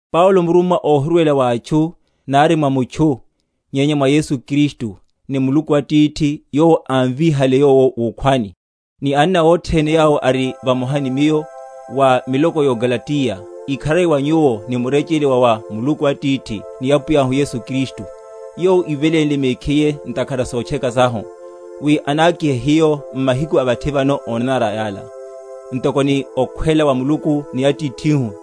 Paulo, murummwa (óhirwela wa atchu, nari mwa mutchu, nyenya mwa Yesu Kristu, ni Muluku Atithi, Yowo ámvíhale Yowo wukhwani), ni anna othene yawo ari vamoha ni miyo, wa miloko yó Galatiya: Ikharari wa nyuwo, ni murechele wa wa Muluku Atithi, ni Apwiyahu Yesu Kristu, yowo ívelénle mekhiye ntakhara a sotcheka sahu, wi anákihe hiyo m’mahiku a vathi vano ónanara yala, ntoko ni okhwela wa Muluku ni Atithihu;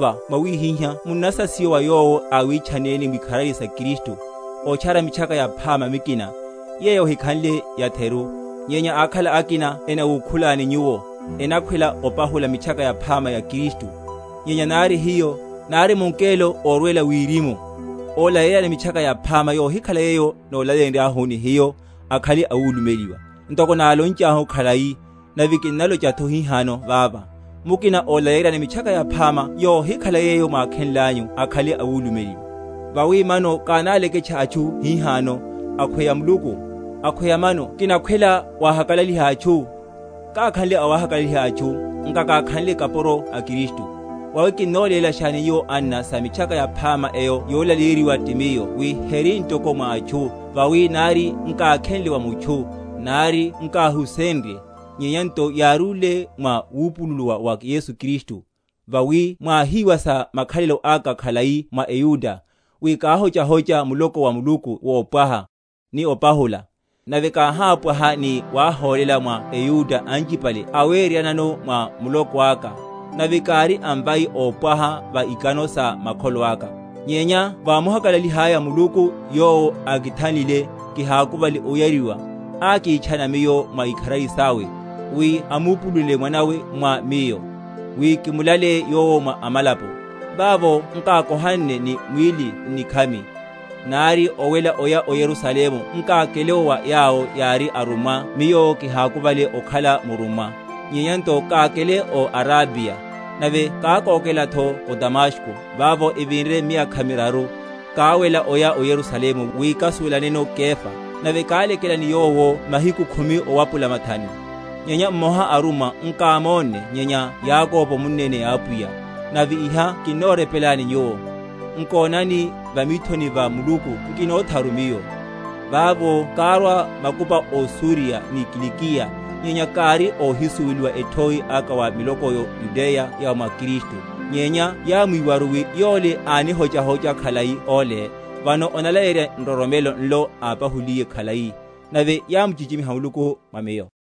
Kinnatikhina wi mwawákuva mwawihiha munnasasiwa wa yowo áwitchanneni mwikharari sa Kristu, otchara Mitchaka Yaphama mikina; yeyo ehikhanle yatheru; nyenya ákhala akina enawukhulani nyuwo, enakhwela opanula Mitchaka Yaphama ya Kristu. Nyenya nari hiyo, nari mungelo órwela wirimu, ólaleyeryani Mitchaka Yaphama yohikhala yeyo nólaleyenryahuni hiyo, akhale awulumeliwa. Ntoko nálonchahu khalai, nave kinnalochatho hihano vava, mukina ólaleyeryani Mitchaka Yaphama yohikhala yeyo mwákhenlanyu akhale awulumeliwa. Vawi mano kináleketcha atchu hihano, akhweya Muluku? Akhweya mano kinakhwela wahakalaliha atchu? Kákhanle awahakalaliha atchu, nkakakhanle kapuro a Kristu. Vawi kinnolélashani nyuwo, anna, sa Mitchaka Yaphama eyo yolaleyeryiwa ti miyo, wi heri ntoko mwa atchu. Vawi nari nkákhenle wa mutchu, nari nkáhusenrye, nyenya nto yárúle mwa wupulula wa Yesu Kristu. Vawi mwáhíwa sa makhalelo aka khalai mwa eYuda, wi káhochahocha muloko wa Muluku wopwaha, ni opahula, nave káhápwaha ni wáhólela mwa eYuda anchipale aweryeryanano mwa muloko aka, nave kári amvai ópwaha va ikano sa makholo aka. Nyenya vámuhakalalihalaya Muluku, yowo ákithanlile, kihakuvale oyariwa, ákitchana miyo mwa ikharari sawe, wi amupulule Mwana awe mwa miyo, wi kimulaleye Yowo mwa amalapo; vavo nkákohanne ni mwíli n’nikhami: nari owela oya o Yerusalemu nkákele’wo wa yawo yári arummwa miyo kihakuvale okhala murummwa, nyenya nto kákele o Arabiya, nave kákokelatho o Damasko. Vavo evinre miyakha miraru, káwela oya o Yerusalemu wi kásuwelaneno Kefa, nave kálekela ni yowo mahiku khumi owapula mathanu. Nyenya mmoha a arummwa nkámonne, nyenya Yakobo munneni a Apwiya. Nave iha kinnorepelani nyuwo, nkonani, va mithoni va Muluku nkinotharu miyo. Vavo kárwa makupa ó Suriya ni Kilikiya. Nyenya kári óhisuweliwa ethoi aka wa miloko yó Yudeya ya mwa Kristu; nyenya yámwíwaru, wi, Yole ánihochahocha khalai ole, vano onalaleyerya nroromelo nlo ápahuliye khalai; nave yámuchichimiha Muluku mwa miyo.